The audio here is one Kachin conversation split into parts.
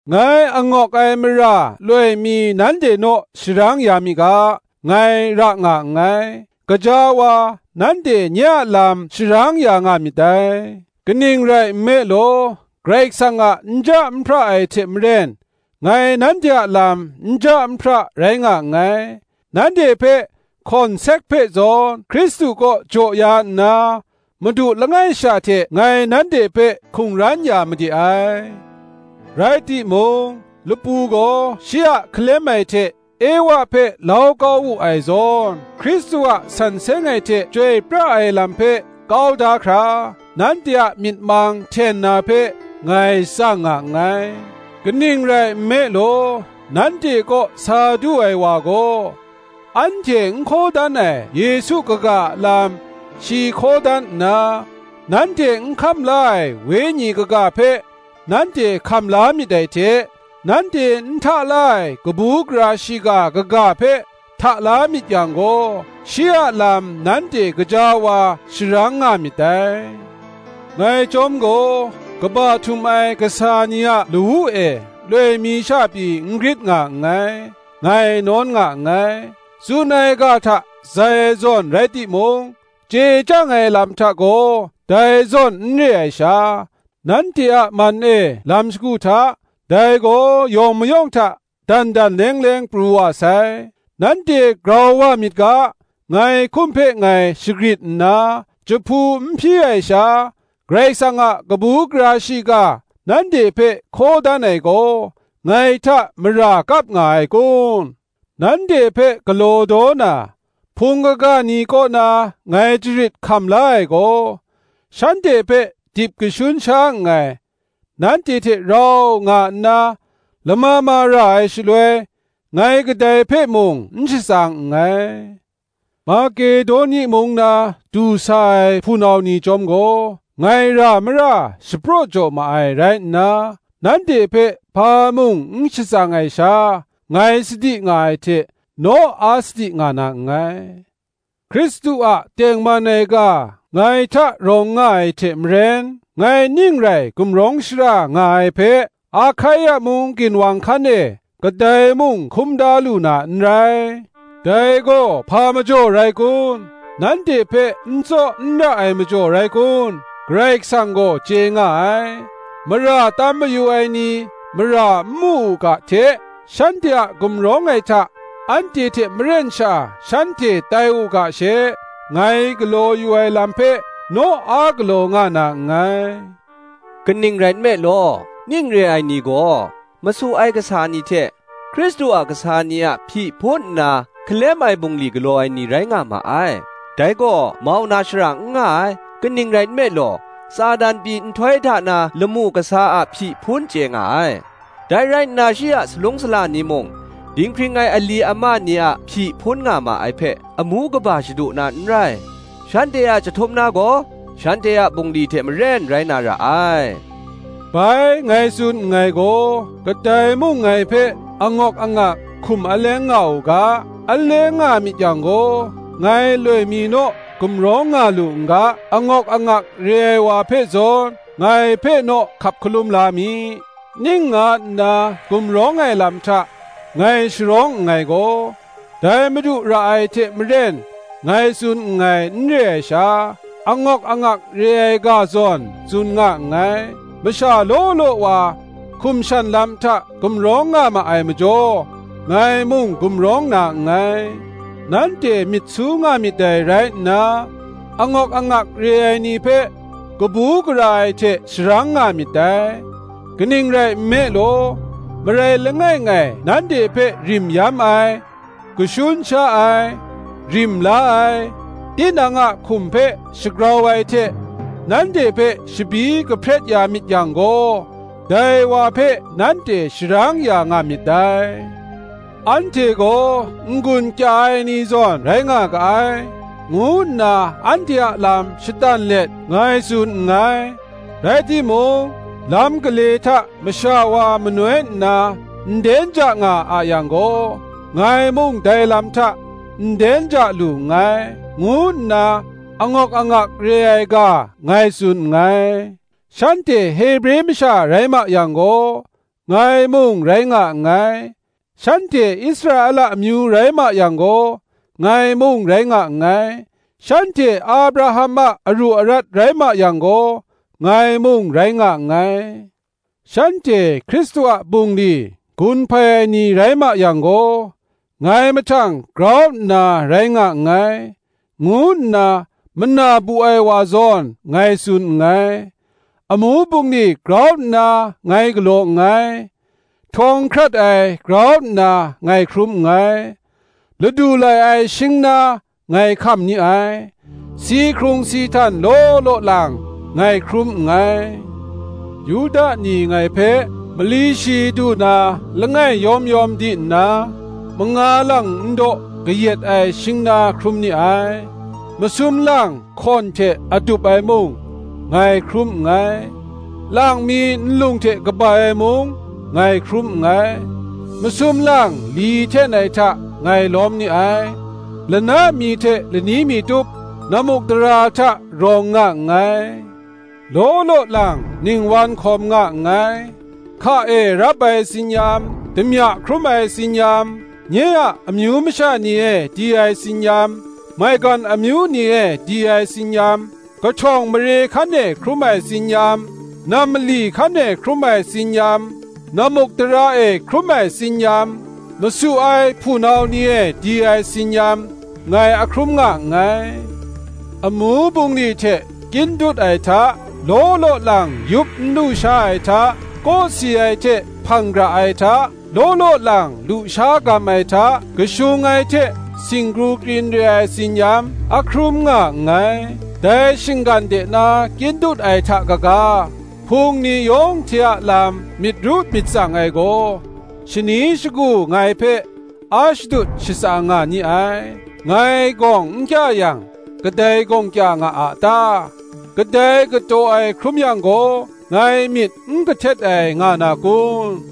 Ngai angawk ai mara loi mi nanhte naw sharang ya mi ga, ngai ra nga nngai: gaja wa nanhte nye a lam sharang ya nga myit dai. Kaning rai nme law, Karai Kasang a nja nhpra ai hte maren, ngai nanhte a lam nja nhpra rai nga nngai; nanhte hpe hkawnsek hpe zawn Hkristu kaw jaw ya nna, madu langai sha hte ngai nanhte hpe hkungran ya made ai. Rai timung, lapu gaw shi a hkalem ai hte Ewa hpe lau kau wu ai zawn, Hkristu a san seng ai hte chyoi pra ai lam hpe kau da hkra, nanhte a myit mang hten na hpe, ngai tsang nga nngai. Kaning rai nme law, nanhte kaw sa du ai wa gaw, anhte n hkaw dan ai Yesu kaga a lam shi hkaw dan nna, nanhte n hkam la ai Wenyi kaga hpe nanhte hkam la myit dai hte, nanhte n hta la ai kabu gara shiga kaga hpe hta la myit yang gaw, shi a lam nanhte gaja wa sharang nga myit dai. Ngai chyawm gaw kaba htum ai kasa ni a lawu e loi mi sha pyi n grit nga nngai, ngai nawn nga nngai. Tsun ai ga hta zai ai zawn rai timung, chye chyang ai lam hta gaw dai zawn n re ai sha, nanhte a man e lam shagu hta, dai gaw yawng mayawng hta, dan dan leng leng pru wa sai. Nanhte grau wa myit ga, ngai hkum hpe ngai shagrit nna, jahpu n hpyi ai sha Karai Kasang a kabu gara shiga nanhte hpe hkaw dan ai gaw, ngai hta mara kap nga ai kun? Nanhte hpe galaw daw na, Hpung kaga ni kaw na ngai jarit hkam la ai gaw, shanhte hpe dip kashun sha nngai; nanhte hte rau nga nna lama ma ra ai shaloi, ngai kadai hpe mung n shatsang nngai: Makedoni mung na du sa ai hpunau ni chyawm gaw ngai ra mara shapraw jaw ma ai rai nna, nanhte hpe hpa mung n shatsang ai sha ngai sadi nga ai hte naw a sadi nga na nngai. Hkristu a tengman ai ga ngai hta rawng nga ai hte maren, ngai ning rai gumrawng shara nga ai hpe Ahkaia mung ginwang hkan e kadai mung hkum da lu na n rai. Dai gaw hpa majaw rai kun? Nanhte hpe n tsaw n ra ai majaw rai kun? Karai Kasang gaw chye nga ai. Mara tam mayu ai ni mara n mu u ga hte, shanhte a gumrawng ai hta anhte hte maren sha shanhte tai u ga she, ngai galaw yu ai lam hpe naw a galaw nga na nngai. Kaning rai nme law, ning re ai ni gaw masu ai kasa ni hte, Hkristu a kasa ni a hpyi hpun nna hkalem ai bungli galaw ai ni rai nga ma ai. Dai gaw mau na shara n nga ai; kaning rai nme law, Satan pyi nhtoi hta na lamu kasa a hpyi hpun chye nga ai; dai rai nna shi a salung sala ni mung, dinghpring ai a ali ama ni a hpyi hpun nga ma ai hpe, amu kaba shadu na n rai: shanhte a jahtum na gaw, shanhte a bungli hte maren rai na ra ai. Bai ngai tsun nngai gaw, kadai mung ngai hpe angawk angak hkum aleng nga u ga: aleng nga myit yang gaw, ngai loi mi naw gumrawng nga lu n ga, angawk angak re ai wa hpe zawn ngai hpe naw hkap hkalum la mi. Ning nga nna gumrawng ai lam hta ngai sharawng nngai gaw, dai Madu ra ai hte maren ngai tsun nngai n re ai sha, angawk angak re ai ga zawn tsun nga nngai. Masha law law wa hkum shan lam hta gumrawng nga ma ai majaw, ngai mung gumrawng na nngai. Nanhte myit su nga myit dai rai nna, angawk angak re ai ni hpe kabu gara ai hte sharang nga myit dai. Kaning rai nme law, marai langai ngai nanhte hpe rim yam ai, kashun sha ai, rim la ai, tinang a hkum hpe shagrau ai hte nanhte hpe shabyi kahpret ya myit yang gaw, dai wa hpe nanhte sharang ya nga myit dai. Anhte gaw n-gun kya ai ni zawn rai nga ga ai, ngu nna anhte a lam shatan let ngai tsun nngai; rai timung lam gale hta masha wa manoi nna nden ja nga a yang gaw, ngai mung dai lam hta nden ja lu nngai, ngu nna angawk angak re ai ga ngai tsun nngai. Shanhte Hebre masha rai ma yang gaw, ngai mung rai nga nngai; shanhte Israela amyu rai ma yang gaw, ngai mung rai nga nngai; shanhte Abraham a aru arat rai ma yang gaw, ngai mung rai nga nngai. Shanhte Hkristu a bungli gun hpai ai ni rai ma yang gaw, ngai mahtang grau nna rai nga nngai, ngu nna mana bu ai wa zawn ngai tsun nngai. Amu bungli grau nna ngai galaw nngai; htawng hkrat ai grau nna ngai hkrum nngai; ladu lai ai shingna ngai hkam ni ai; si hkrung si htan law law lang ngai hkrum nngai. Yuda ni ngai hpe mali shi du na langai yawm yawm di nna, manga lang ndaw kayat ai shingna hkrum ni ai. Masum lang hkawn hte adup ai mung ngai hkrum nngai; lang mi nlung hte kabai ai mung ngai hkrum nngai: masum lang li hten ai hta ngai lawm ni ai; lana mi hte lani mi tup nammukdara hta rawng nga nngai. Law law lang ningwan hkawm nga nngai; hka e rap ai tsin-yam, damya hkrum ai tsin-yam, nye a amyu masha ni e di ai tsin-yam, maigan amyu ni e di ai tsin-yam, kahtawng mare hkan e hkrum ai tsin-yam, nam mali hkan e hkrum ai tsin-yam, nammukdara e hkrum ai tsin-yam, masu ai hpunau ni e di ai tsin-yam ngai a hkrum nga nngai; amu bungli hte kyin dut ai hta, law law lang yup n lusha ai hta, kawsi ai hte hpang gara ai hta, law law lang lusha gam ai hta, kashung ai hte shinggu krin re ai, tsin-yam, a hkrum nga nngai. Dai shinggan de na kyin dut ai hta kaga, Hpung ni yawng hte a lam myit ru myit tsang ai gaw, shani shagu ngai hpe a shadut shatsang nga ni ai. Ngai gawng n kya yang, kadai gawng kya nga a ta? kadai kataw ai hkrum yang gaw, ngai myit n kahtet ai nga na kun?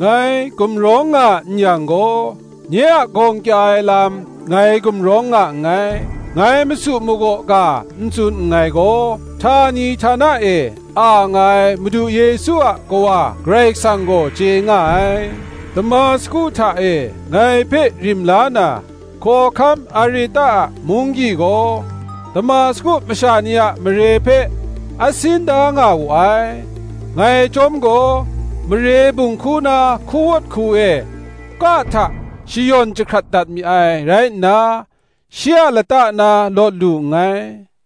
Ngai gumrawng nga n yang gaw, nye a gawng kya ai lam ngai gumrawng nga nngai. Ngai masu magaw ga n tsun nngai gaw, htani htana e a nga ai Madu Yesu a Kawa Karai Kasang gaw chye nga ai. Damasku hta e ngai hpe rim la na hkawhkam Areta a munggyi gaw Damasku masha ni a mare hpe a sin da nga wu ai. ngai chyawm gaw, mare bunghku na hkuwawt hku e, ka hta shayawn jahkrat dat mi ai rai nna, shi a lata na lawt lu nngai.